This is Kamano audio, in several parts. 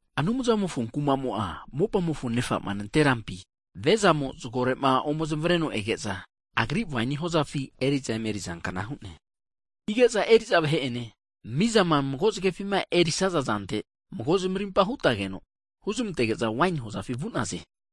Anumzamofo kumamo'a, mopamofo nefa'ma nante'rampi viazamo zgore'ma omezmareno ege'za agri waini hozafi eri'za emeri'za kna hu'ne. Hige'za eri'za vahe'ene mizama mago zgefima erisaza zante, mago zmarimpa hutageno, huzmantege'za waini hoza'afi vu'naze.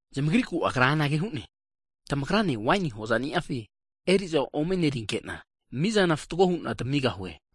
Zamagriku Agra anage hu'ne, tamagrane waini hozani'afi eri'za omenerinkena, mizana fatgo hu'na tamigahue.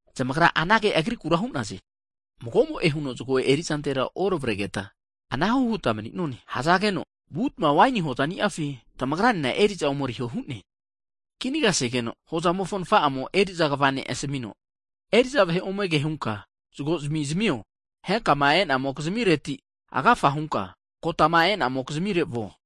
Zamagra anage Agriku hu'naze, mago'mo'e huno zgo erizantera oravregeta anahu huta mni'none. Hzageno, vutma waini hozani'afi tamagra 'nena eri'za ome eriho hu'ne. Kinagasegeno hozamofo nfa'amo eri'za kva ne' asamino, eri'za vahe ome ke hunka zgozimi zmio, henkama e'namokizmireti agafa hunka kotama e'namokizmire vuo.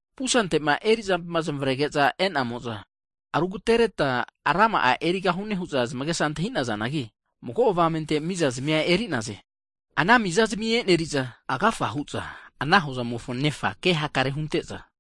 Pusantema eri'zampima zmavrege'za eri'namo'za e'za, rugatereta rama'a erigahune hu'za zmagesa antahinazanagi, mago avamente miza zmia eri'naze. Ana miza eneriza, agafahu'za ana hozamofo nefa kehakare hunte'za,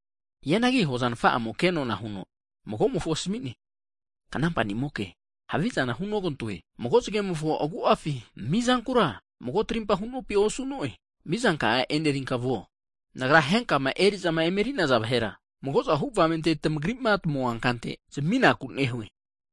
Hianagi hoza nfa'amo ke nona huno mago'mofo asmi'ne, knampa nimoke, havizana hunogantoe. Mago zge'mofo agu'afi mizankura mago trimpa hunopi osu'no'e? Mizanka'a e'nerinka vuo. Nagra henkama eri'za emeri'naza vahera, magozahu avamente tamagrima tamua kante zaminaku nehue.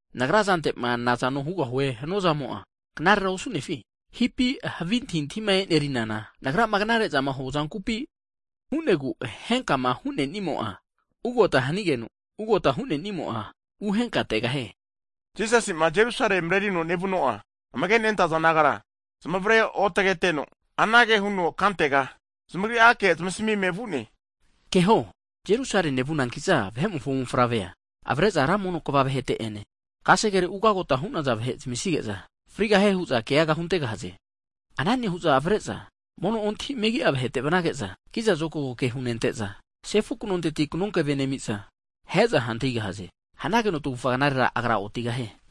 Nagra zantema nazano hugahue hanuazamo'a knarera osu'nefi? Hipi havi antahintahima e'nerinana nagrama knare'zama huazankupi? Hu'negu, henkama hunenimo'a ugagota hanigeno, ugagota hunenimo'a uhenkategahie. Jisasi'ma Jerusale mrerino nevuno'a amage nentaza disaipol nagara, zmavare otage atreno anage huno kantega zamagri'ake zamasamime vu'ne, Keho, Jerusale nevunankiza, Vahe'mofo Mofavrea avare'za ra mono kva vahete ene, kasegere ugagota hu'naza vahe zmisige'za, frigahie hu'za keaga huntegahaze. Ana nehu'za avare'za mono ontahi megi'a vahete vnage'za, kiza zokago ke hunente'za sefu knonteti knonkeve nemiza ahe'za hantigahaze. Hanageno tagufa knarera agra otigahie.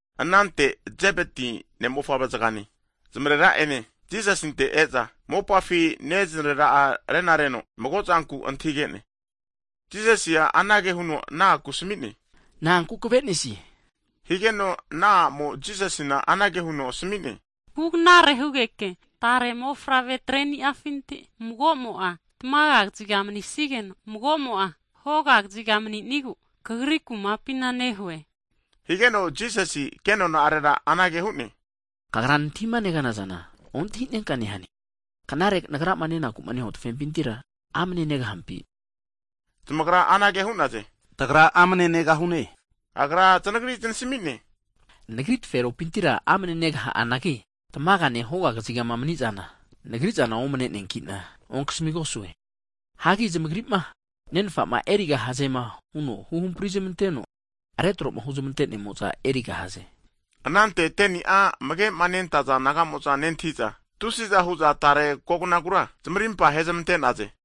Anante Zebeti ne' mofavre zgane nezmarera ene Jisasinte e'za, mopafi neznerera'a renareno mago zanku antahige'ne. Jisasi'a anage huno ana aku asami'ne. Na'anku kavenesie? Higeno ana a'mo Jisasina anage huno asami'ne, hugnare hugeke tare mofavre treniafinti mago'mo'a tamaga kaziga manisigeno, magomo'a hoga kaziga mani'nogu Kagri kumapina nehue. Higeno Jisasi kenona'arera anage hu'ne, Kagra nantahima neganazana ontahinenka nehane! Knare Nagrama nenaku'ma nehua tafempintira amne negahampi? huno zmantahigege'za, zamagra anage hu'naze, Tagra amne negahune, hu'naze. Agra zanagri znasmi'ne, Nagri taferopintira amne negaha'anagi tamagani'ane, hoga kaziga mni'zana, Nagrizana omne'neakina ontanasamigosue. Hagi zamagri'ma Nenfama erigahaze hunoma huhampri zmanteno retroma huzmante'nemo'za erigahaze. Anante 10ni'a amagema nentaza disaipol nagamo'za nentahiza, tusiza hu'za tare kognagura zmarimpa hezmante'naze.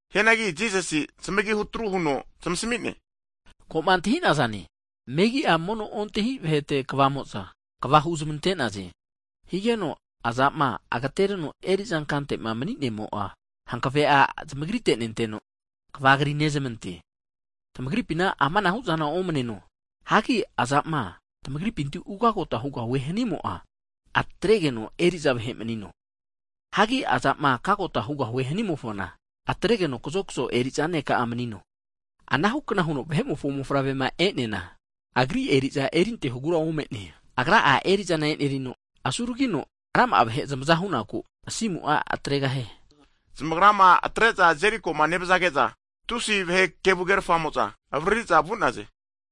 Hianagi Jisasi zmagi hutru huno zmasmi'ne, koma antahinazane, megia mono ontahi vahete kvamo'za, kva huzmante'naze. Higeno iza'o agatereno eri'za kantema mni'nemo'a hankave'a zmagrite nenteno kva kri'nezmante. Tamagripina amanahu'zana omneno. Hagi iza'o tamagripinti ugagota hugahue hanimo'a, atregeno eriza vahe manino. Hagi iza'o kagota hugahue hanimofona, atregeno kazokzo eriza ne'ka'a manino. Anahu kna huno Vahe'mofo Mofavre'ma e'neana, Agri eriza erintehogura ome'ne, Agra'a erizana enerino, asuragino rama'a vahe zmaza huno misa senaku asimu'a atregahie. Zamagrama atre'za Jerikoma nevzage'za, tusi vahe kevu krerfamo'za avariri'za vu'naze.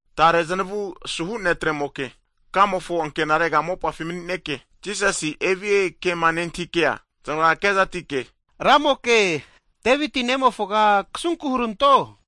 Tare znavu asuhu netre'moke kamofo ankenare mopafi mni'neke, Jisasi evie kema nentahikea, znagra kezatike, Ramoke, Deviti nemofoga kasunku huranto.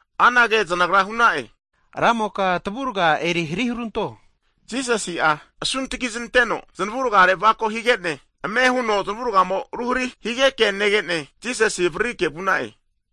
anage znagra hu'na'e, Ramoka tavurga eri hari huranto hakeno, Jisasi'a asuntgi znanteno zanavurgare znavako higeno, ame huno zanavurga ruhari higeke nege'ne Jisasi avaririke vu'na'e.